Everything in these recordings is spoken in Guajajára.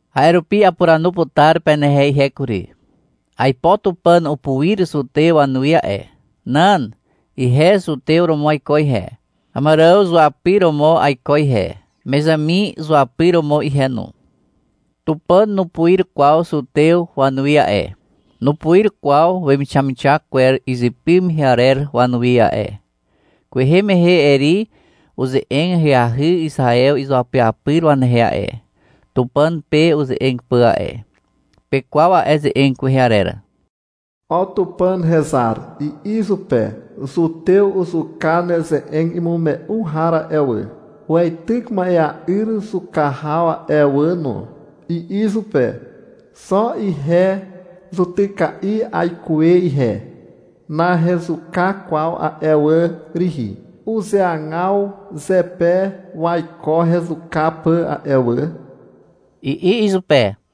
A'e rupi apuranu putar penehe ihe kury. Aipo Tupàn upuir zutew wanuwi a'e. Nan. Ihe zutew romo aiko ihe. Àmàrààw zuapyr romo aiko ihe, Mezàmi zuapyr romo ihe no. Tupàn nupuir kwaw zutew wanuwi a'e, nupuir kwaw wemixamixak kwer izypy mehe arer wanuwi a'e. Kwehe mehe Eri uze'eg ahyahy Izaew izuapyapyr wanehe a'e, Tupàn pe uze'eg pà a'e. Pekwaw a'e ze'eg kwehe arer. — O Tupàn hezar, i'i izupe. — Zutew uzuka neze'eg imume'u har a'e wà. Weityk ma'ea'yr zuka haw a'e wà no, i'i izupe. — Xo ihe zutyka'i aikuwe ihe, nahezuka kwaw a'e wà rihi. Uzeagaw zepe waiko hezuka pà a'e wà, i'i izupe.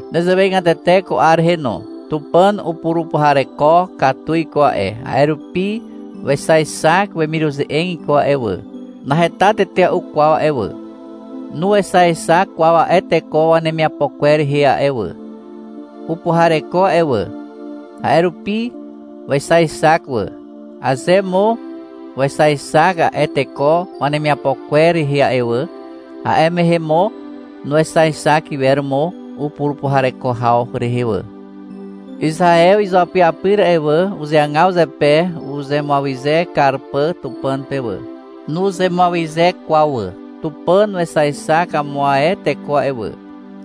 Nezewegatete ko 'ar rehe no. Tupàn upurupuhareko katu iko a'e. A'e rupi wexaexak wemiruze'eg iko a'e wà. Naheta tetea'u kwaw a'e wà. Nuexaexak kwaw a'e teko wanemiapo kwer rehe a'e wà. Upuhareko a'e wà, a'e rupi wexaexak wà. Aze mo wexaexak a'e teko wanemiapo kwer rehe wà, a'e mehe mo nuexaexak iwer mo upurupuhareko haw rehe wà. Izaew izuapyapyr a'e wà, uzeagaw zepe uzemuawyze kar pà Tupàn pe wà. Nuzemuawyze kwaw wà. Tupàn wexaexak amo ae teko a'e wà.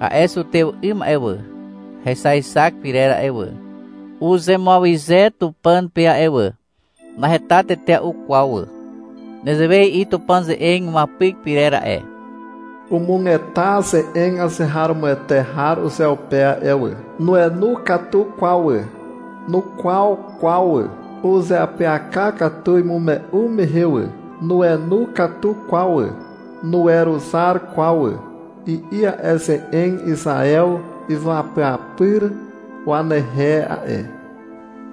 A'e zutew 'ym a'e wà, hexaexak pyrer a'e wà, uzemuawyze Tupàn pe a'e wà. Naheta tetea'u kwaw wà. Nezewe i'i Tupàn ze'eg imuapyk pyrer a'e. — Umugeta ze'eg azeharomoete har uzeupe a'e wà. Nuenu katu kwaw wà, nukwaw kwaw wà. Uzeapyaka katu imume'u mehe wà. Nuenu katu kwaw wà, nuweruzar kwaw wà, i'i a'e ze'eg Izaew izuapyapyr wanehe a'e.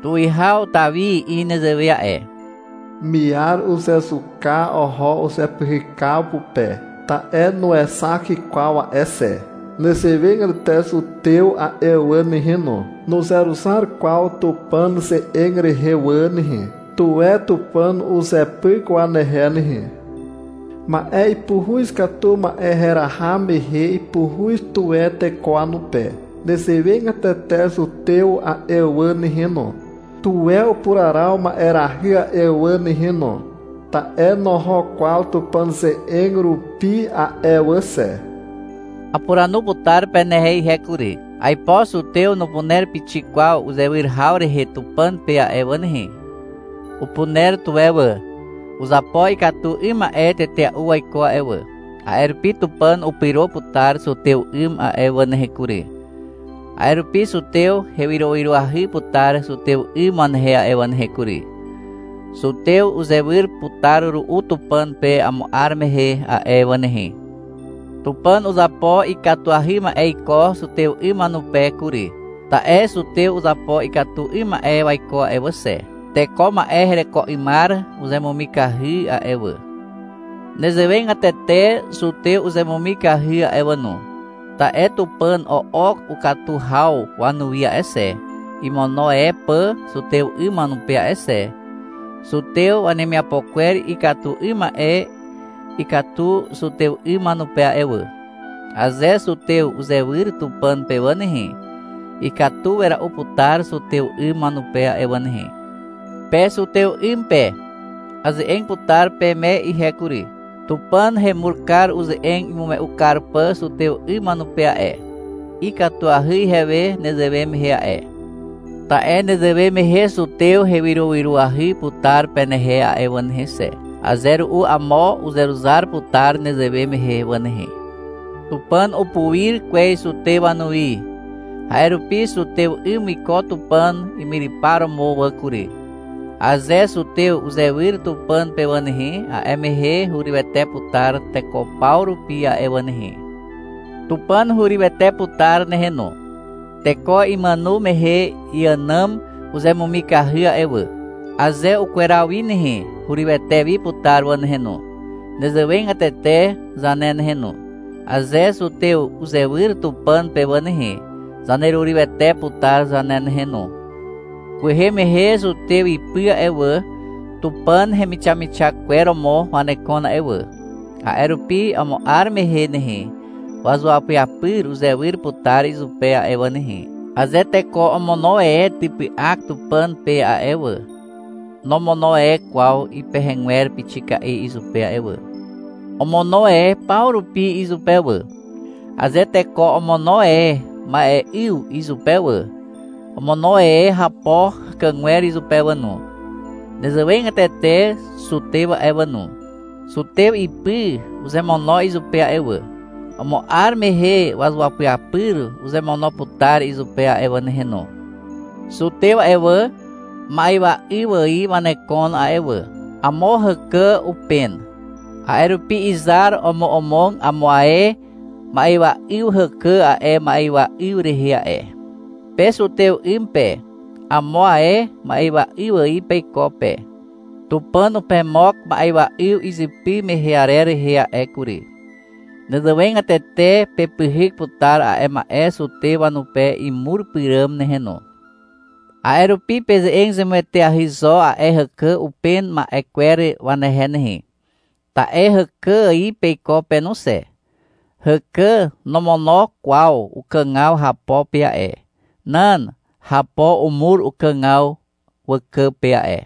Tuwihaw Tawi i'i nezewe a'e. — Miar uzezuka oho uzepyhykaw pupe, ta'e nuexak kwaw a'e xe. Nezewegatete zutew a'e wà nehe no. Nuzeruzar kwaw Tupàn ze'eg rehe wà nehe. Tuwe Tupàn uzepyk wanehe nehe. Ma'e ipuhuz katu ma'e heraha mehe ipuhuz tuwe teko wanupe. Nezewegatete zutew a'e wà nehe no, tuwe upuraraw ma'erahy a'e wà nehe no, ta'e noho kwaw Tupàn ze'eg rupi a'e wà xe. Apuranu putar penehe ihe kury. Aipo zutew nupuner pixik kwaw uzewyr haw rehe Tupàn pe a'e wà nehe. Upuner tuwe wà. Uzapo ikatu 'ym ma'e tetea'u waiko a'e wà, a'e rupi Tupàn upyro putar zutew 'ym a'e wà nehe kury. A'e rupi zutew hewyrowyroahy putar zutew 'ym wanehe a'e wà nehe kury. Zutew uzewyr putar ru'u Tupàn pe amo 'ar mehe a'e wà nehe. Tupàn uzapo ikatuahy ma'e iko zutew 'ym wanupe kury, ta'e zutew uzapo ikatu 'ym ma'e waiko a'e wà xe. Teko ma'e hereko 'ymar uzemumikahy a'e wà. Nezewegatete zutew uzemumikahy a'e wà no, ta'e Tupàn o'ok ukatu haw wanuwi a'e xe, imono e pà zutew 'ym wanupe a'e xe. Zutew wanemiapo kwer ikatu 'ym ma'e ikatu zutew 'ym wanupe a'e wà. Aze zutew uzewyr Tupàn pe wà nehe, ikatu wera'u putar zutew 'ym wanupe a'e wà nehe. Pe zutew 'ym pe, aze'eg putar peme ihe kury. Tupàn hemur kar uze'eg imume'u kar pà zutew 'ym wanupe a'e. Ikatuahy ihewe nezewe mehe a'e. Ta'e nezewe mehe zutew hewyrowyroahy putar penehe a'e wà nehe xe. Aze ru'u amo uzeruzar putar nezewe mehe wà nehe. Tupàn upuir kwez zutew wanuwi. A'e rupi zutew 'ym wiko Tupàn imyrypar romo wà kury. Aze zutew uzewyr Tupàn pe wà nehe, a'e mehe hurywete putar teko paw rupi a'e wà nehe. Tupàn hurywete putar nehe no. Teko imàno mehe iànàm uzemumikahy a'e wà. Aze ukweraw wi nehe, hurywete wi putar wà nehe no. Nezewegatete zane nehe no. Aze zutew uzewyr Tupàn pe wà nehe, zanerurywete putar zane nehe no. Kwehe mehe zutew ipy a'e wà, Tupàn hemixamixak kwer romo wanekon a'e wà. A'e rupi amo 'ar mehe nehe, wazuapyapyr uzewyr putar izupe a'e wà nehe. Aze teko omono e typy'ak Tupàn pe a'e wà, nomono e kwaw ipehegwer pixika'i izupe a'e wà. Omono e paw rupi izupe wà. Aze teko omono e ma'e'yw izupe wà, omono e hapo hàkàgwer izupe wà no. Nezewegatete zutew a'e wà no. Zutew ipy uzemono izupe a'e wà. Amo 'ar mehe wazuapyapyr uzemono putar izupe a'e wà nehe no. Zutew a'e wà, ma'ywa 'yw ài wanekon a'e wà. Amo hàkà upen. A'e rupi izar omomog amo ae ma'ywa 'yw hàkà a'e ma'ywa 'yw rehe a'e. Pe zutew 'ym pe, amo ae ma'ywa 'yw ài peiko pe. Tupàn pemog ma'ywa 'yw izypy mehe arer rehe a'e kury. Nezewegatete pepyhyk putar a'e ma'e zutew wanupe imur pyràm nehe no. A'e rupi peze'eg zemueteahy zo a'e hàkà upen ma'e kwer wanehe nehe. Ta'e hàkà ài peiko pe no xe. Hàkà nomono kwaw ukàgaw hapo pe a'e. Nan. Hapo umur ukàgaw wàkà pe a'e.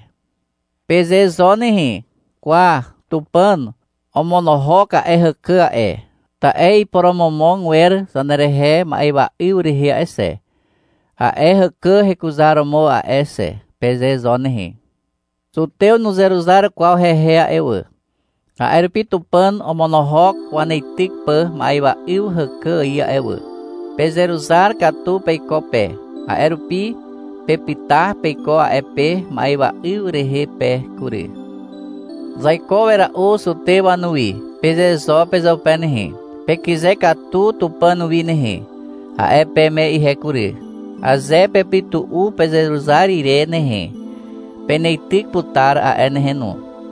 Peze zo nehe, — Kwa, Tupàn omonohok a'e hàkà a'e, ta'e iporomomog wer zanerehe ma'ywa'yw rehe a'e xe, a'e hàkà hekuzaromo a'e xe, peze zo nehe. Zutew nuzeruzar kwaw hehe a'e wà, a'e rupi Tupàn omonohok waneityk pà ma'ywa'yw hàkà ài a'e wà. Pezeruzar katu peiko pe, a'e rupi pepyta peiko a'e pe ma'ywa 'yw rehe pe kury. — Zaiko wera'u zutew wanuwi, peze zo pezeupe nehe. — Pekyze katu Tupàn wi nehe, a'e peme ihe kury. (Aze pepytu'u pezeruzar ire nehe, peneityk putar a'e nehe no.)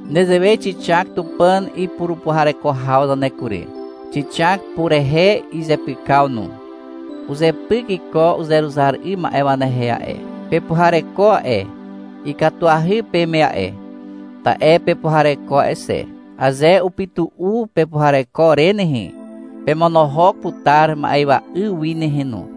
Nezewe xixak Tupàn ipurupuhareko haw zane kury. Xixak purehe izepykaw no. Uzepyk iko uzeruzar 'ym ma'e wanehe a'e. Pepuhareko a'e. Ikatuahy peme a'e, ta'e pepuhareko a'e xe. Aze upytu'u pepuhareko re nehe, pemonohok putar ma'ywa 'yw wi nehe no.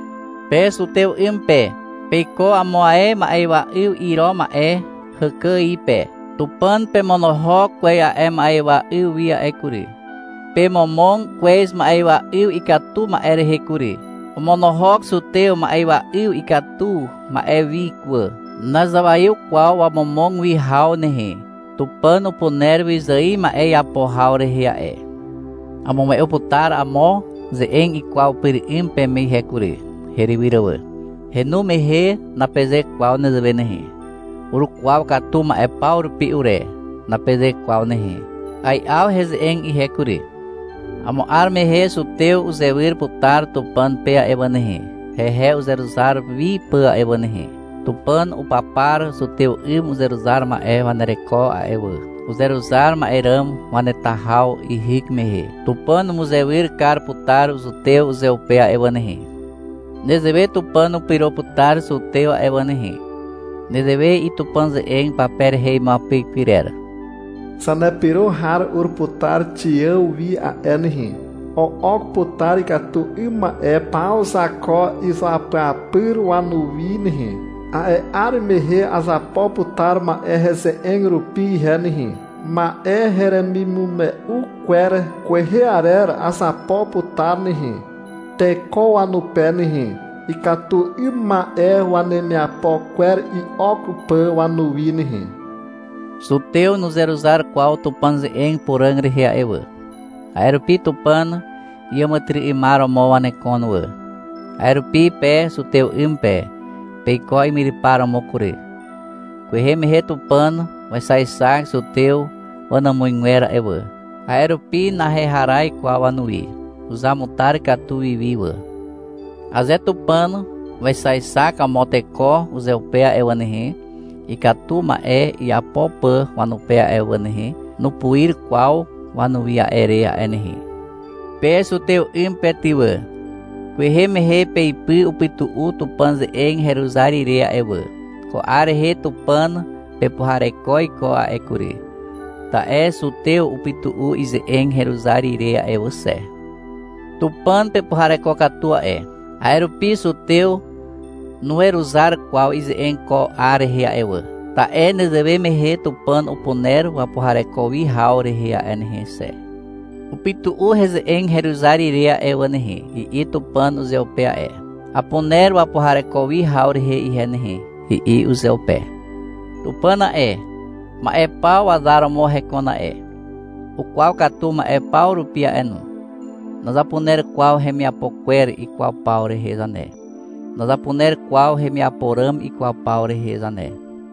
Pe zutew 'ym pe, peiko amo ae ma'ywa 'yw iro ma'e hàkà ài pe. Tupàn pemonohok kwez a'e ma'ywa'yw wi a'e kury. Pemomog kwez ma'ywa 'yw ikatu ma'e rehe kury. Omonohok zutew ma'ywa 'yw ikatu ma'e wi wà. Nazawaiw kwaw wamomog wi haw nehe. Tupàn upuner wyzài ma'e iapo haw rehe a'e. Amume'u putar amo ze'eg ikwaw pyr 'ym peme ihe kury, herywyr wà. Henu mehe napeze kwaw nezewe nehe. — Urukwaw katu ma'e paw rupi ure, napeze kwaw nehe. Ai'aw heze'eg ihe kury. — Amo 'ar mehe zutew uzewyr putar Tupàn pe a'e wà nehe, hehe uzeruzar wi pà a'e wà nehe. Tupàn upapar zutew 'ym uzeruzar ma'e wanereko a'e wà. Uzeruzar ma'e ràm waneta haw ihyk mehe, Tupàn umuzewyr kar putar zutew uzeupe a'e wà nehe. Nezewe Tupàn upyro putar zutew a'e wà nehe. Nezewe i'i Tupàn ze'eg pape rehe imuapyk pyrer. — Zanepyro har ur putar Xiàw wi a'e nehe. O'ok putar ikatu 'ym ma'e paw Zako izuapyapyr wanuwi nehe. A'e 'ar mehe azapo putar ma'e heze'eg rupi ihe nehe. Ma'e heremimume'u kwer kwehe arer azapo putar nehe, teko wanupe nehe, ikatu 'ym ma'e wanemiapo kwer i'ok pà wanuwi nehe. Zutew nuzeruzar kwaw Tupàn ze'eg puràg rehe a'e wà. A'e rupi Tupàn iàmàtyry'ymar romo wanekon wà. A'e rupi pe zutew 'ym pe, peiko imyrypar romo kury. Kwehe mehe Tupàn wexaexak zutew wanàmuzgwer a'e wà. A'e rupi naheharaz kwaw wanuwi. Uzamutar katu wi wi wà. Aze Tupàn wexaexak amo teko uzeupe a'e wà nehe, ikatu ma'e iapo pà wanupe a'e wà nehe, nupuir kwaw wanuwi a'e re a'e nehe. Pe zutew 'ym pe ty wà, kwehe mehe peipy upytu'u Tupàn ze'eg heruzar ire a'e wà. Ko 'ar rehe Tupàn pepuhareko iko a'e kury, ta'e zutew upytu'u ize'eg heruzar ire a'e wà xe. Tupàn pepuhareko katu a'e. A'e rupi zutew nuweruzar kwaw ize'eg ko 'ar rehe a'e wà, ta'e nezewe mehe Tupàn upuner wapuhareko wi haw rehe a'e nehe xe. — Upytu'u heze'eg heruzar ire a'e wà nehe, i'i Tupàn uzeupe a'e. Apuner wapuhareko wi haw rehe ihe nehe, i'i uzeupe. Tupàn a'e, ma'e paw wazar romo hekon a'e. Ukwaw katu ma'e paw rupi a'e no. Nazapuner kwaw hemiapo kwer ikwaw paw rehe zane. Nazapuner kwaw hemiapo ràm ikwaw paw rehe zane.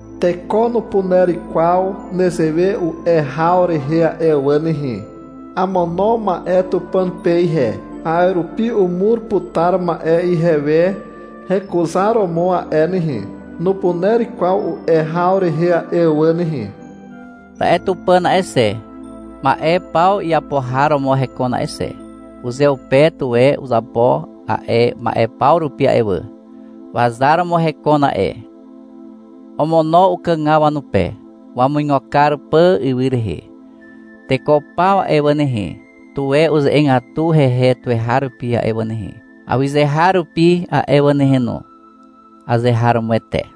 Teko nupuner kwaw nezewe u'e haw rehe a'e wà nehe. — Amono ma'e Tupàn pe ihe. A'e rupi umur putar ma'e ihewe hekuzaromo a'e nehe, nupuner kwaw u'e haw rehe a'e wà nehe. Ta'e Tupàn a'e xe, ma'e paw iapo har romo hekon a'e xe. Uzeupe tuwe uzapo a'e ma'e paw rupi a'e wà. Wazar romo hekon a'e. Omono ukàgaw wanupe, wamuigo kar pà ywy rehe. Teko paw a'e wà nehe, tuwe uze'egatu hehe tuweharupi a'e wà nehe, awyzeharupi a'e wà nehe no. Azeharomoete.